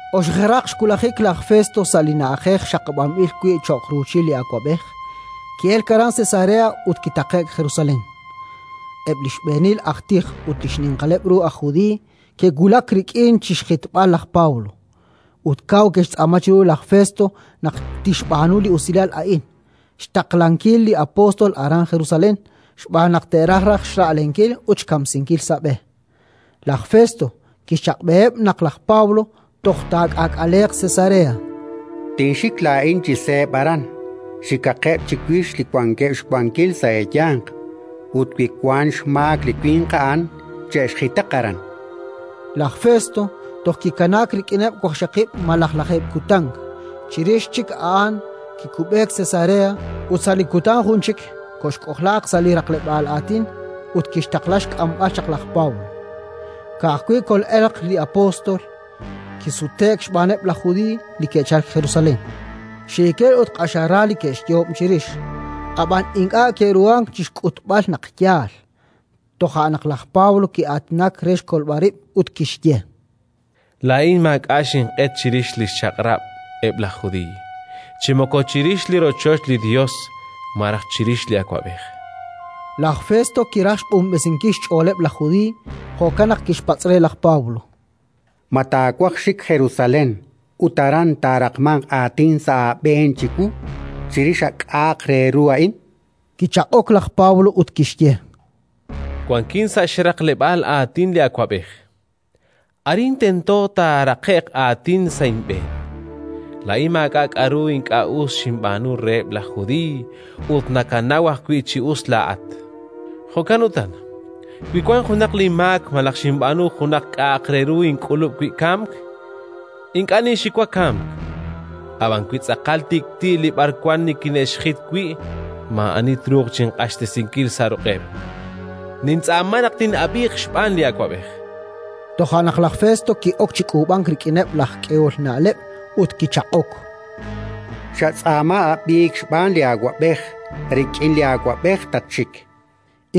Oxejeraq xwulajik laj Festo sa' li na'ajej xaqab'anb'il wi' cho'q ruuchil li awab'ej, ki'elk aran Cesarea ut kitaqe'k Jerusalén. Eb' li xb'eenil aj tij ut li xninqaleb' ru aj Judiiy ke'wulak rik'in chi xjitb'al laj Pablo, ut kaw ke'xtz'aama chiru laj Festo naq tixb'aanu li usilal a'in: xtaqlankil li apóstol aran Jerusalén, xb'aan naq te'raj raj xra'lenkil ut xkamsinkil sa' b'e. Laj Festo kixchaq'b'eheb' naq laj Pablo toj taak'aak'aleeq Cesarea: “Tinxik laa'in chi seeb' aran -chan reheb'-. Xikaqeb' chiwix li wankeb' xwankil sa' eeyanq ut, wi wank xmaak li winq a'an, che'xjitaq aran”. Laj Festo toj kikanaak rik'ineb' waqxaqib' malaj lajeeb' kutan; chirix chik a'an kikub'eek Cesarea ut sa' li kutan jun chik koxk'ojlaaq sa' li raqleb'aal aatin ut kixtaqla xk'amb'al chaq laj Pablo. Ka'ajwi' kol'elq li apóstol, kisute'k xb'aaneb' laj Judiiy li ke'chalk Jerusalén. Xiikil ut q'axal ra li ke'xyoob' chirix, ab'an ink'a' ke'ruhank chi xk'utb'al naq yaal. Toja' naq laj Pablo ki'aatinak re xkolb'al rib' ut kixye: —Laa'in maak'a' xinq'et chirix li xchaq'rab' eb' laj Judiiy chi moko chirix li rochoch li Yos malaj chirix li awab'ej. Laj Festo kiraj xq'unb'esinkil xch'ooleb' laj Judiiy; jo'kan naq kixpatz' re laj Pablo: —Ma taawaj xik Jerusalén, ut aran taaraqmanq aatin sa' aab'een chiwu, chirix a k'a'aq re ru a'in? chan re. Kichaq'ok laj Pablo ut kixye: —Wankin sa' li xraqleb'aal aatin li awab'ej: arin tento taaraqe'q aatin sa' inb'een. Laa'in maak'a' k'aru ink'a' us xinb'aanu reheb' laj Judiiy, ut nakanaw ajwi' chi us laa'at. Jo'kan utan, wi wank junaq linmaak malaj xinb'aanu junaq k'a'aq re ru ink'ulub' wi' kamk, ink'a' ninxiwa kamk. Ab'an wi tz'aqal tik'ti' li b'arwan nikine'xjit wi', maa'ani truuq chinq'axtesinkil sa' ruq'eb'. Nintz'aama naq tin'ab'iiq xb'aan li awab'ej. Toja' naq laj Festo ki'ok chi k'uub'ank rik'ineb' laj k'ehol na'leb' ut kichaq'ok: —Xatz'aama ab'iik xb'aan li awab'ej. Rik'in li awab'ej tatxik, chan re.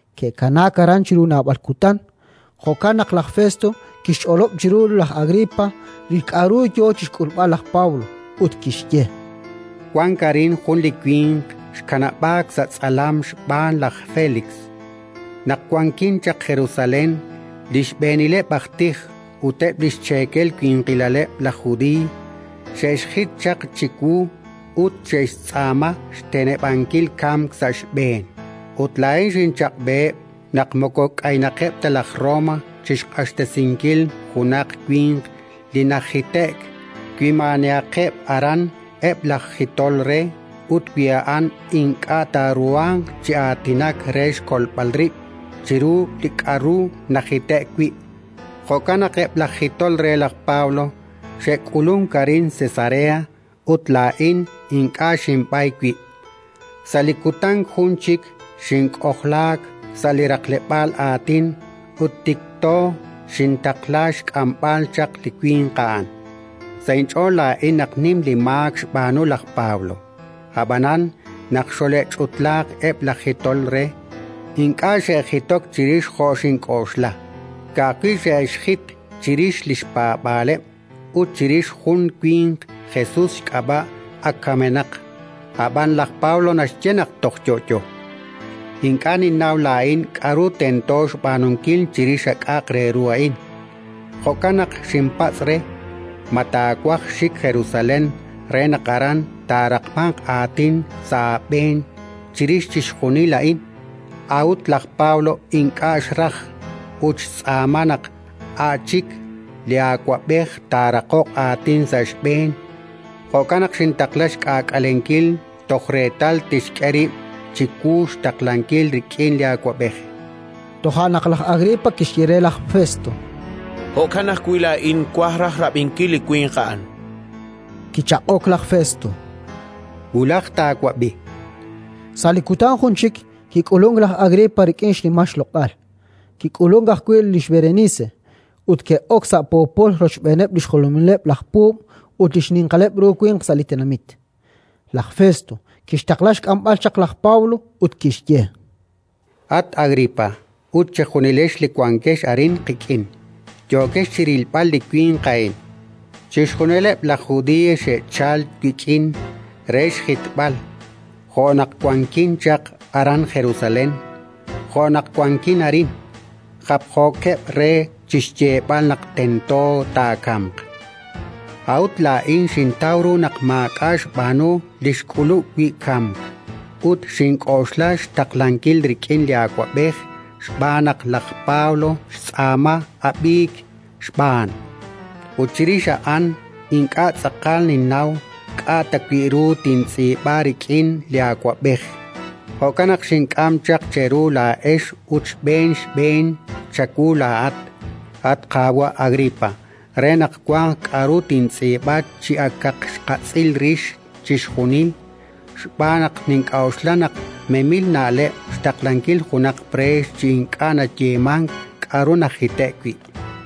Ke'kanaak aran chiru naab'al kutan, jo'kan naq laj Festo kixch'olob' chiru laj Agripa li k'aru yo chi xk'ulb'al laj Pablo, ut kixye: —Wank arin jun li winq xkanab'aak sa' tz'alam xb'aan laj Félix. Naq wankin chaq Jerusalén, li xb'eenileb' aj tij ut eb' li xcheekel winqilaleb' laj Judiiy xe'xjit chaq chiwu ut xe'xtz'aama xteneb'ankil kamk sa' xb'een. Ut laa'in xinchaq'b'eheb' naq moko k'aynaqeb' ta laj Roma chi xq'axtesinkil junaq winq li najite'k, wi maa'anihaqeb' aran eb' laj jitol re ut wi a'an ink'a' taaruhanq chi aatinak re xkolb'al rib' chiru li k'aru najite'k wi'. Jo'kan naq eb' laj jitol re laj Pablo xe'k'ulunk arin Cesarea ut laa'in ink'a' xinb'ay wib': sa' li kutan jun chik xink'ojlaak sa' li raqleb'aal aatin ut tikto xintaqla xk'amb'al chaq li winq a'an. Sa' inch'ool laa'in naq nim li maak xb'aanu laj Pablo. Ab'anan naq xole'ch'utlaaq eb' laj jitol re, ink'a' xe'jitok chirix jo' xink'oxla. Ka'ajwi' xe'xjit chirix li xpaab'aaleb' ut chirix jun li winq Jesus xk'ab'a', ak kamenaq, ab'an laj Pablo naxye naq toj yo'yo. Ink'a' ninnaw laa'in k'aru tento xb'aanunkil chirix a k'a'aq re ru a'in. Jo'kan naq xinpatz' re: «Ma taawaj xik Jerusalén re naq aran taaraqmanq aatin sa' aab'een chirix chixjunil a'in?». A'ut laj Pablo ink'a' xraj, ut xtz'aama naq a' chik li awab'ej A'an li awab'ej Nerón. taaraqoq aatin sa' xb'een; jo'kan naq xintaqla xk'aak'alenkil toj reetal tixk'e rib' chiwu xtaqlankil rik'in li awab'ej. Toja' naq laj Agripa kixye re laj Festo: —Jo'kan ajwi' laa'in twaj raj rab'inkil li winq a'an. Kichaq'ok laj Festo: —Wulaj taawab'i, chan. Sa' li kutan jun chik kik'ulunk laj Agripa rik'in xnimal xloq'al; kik'ulunk ajwi' lix Berenice, ut ke'ok sa' poopol rochb'eeneb' li xjolomileb' laj puub' ut li xninqaleb' ru winq sa' li tenamit. Laj Festo kixtaqla xk'amb'al chaq laj Pablo ut kixye: —At Agripa ut chejunilex li wankex arin qik'in, yookex chi rilb'al li winq a'in. Chixjunileb' laj Judiiy xe'chalk wik'in re xjitb'al, jo' naq wankin chaq aran Jerusalén, jo' naq wankin arin, japjookeb' re chi xyeeb'al naq tento taakamq. A'ut laa'in xintaw ru naq maak'a' xb'aanu li xk'ulub' wi' kamk ut xink'oxla xtaqlankil rik'in li awab'ej xb'aan naq laj Pablo xtz'aama ab'iik xb'aan. Ut chirix a'an ink'a' tz'aqal ninnaw k'a' ta wi' ru tintz'iib'a rik'in li awab'ej; jo'kan naq xink'am chaq cheru laa'ex ut xb'een xb'een chawu laa'at, at qaawa' Agripa, re naq wanq k'aru tintz'iib'a chi akaq xqatz'il rix chixjunil. Xb'aan naq nink'oxla naq memil na'leb' xtaqlankil junaq preex chi ink'a' nayeemank k'aru najite'k wi'.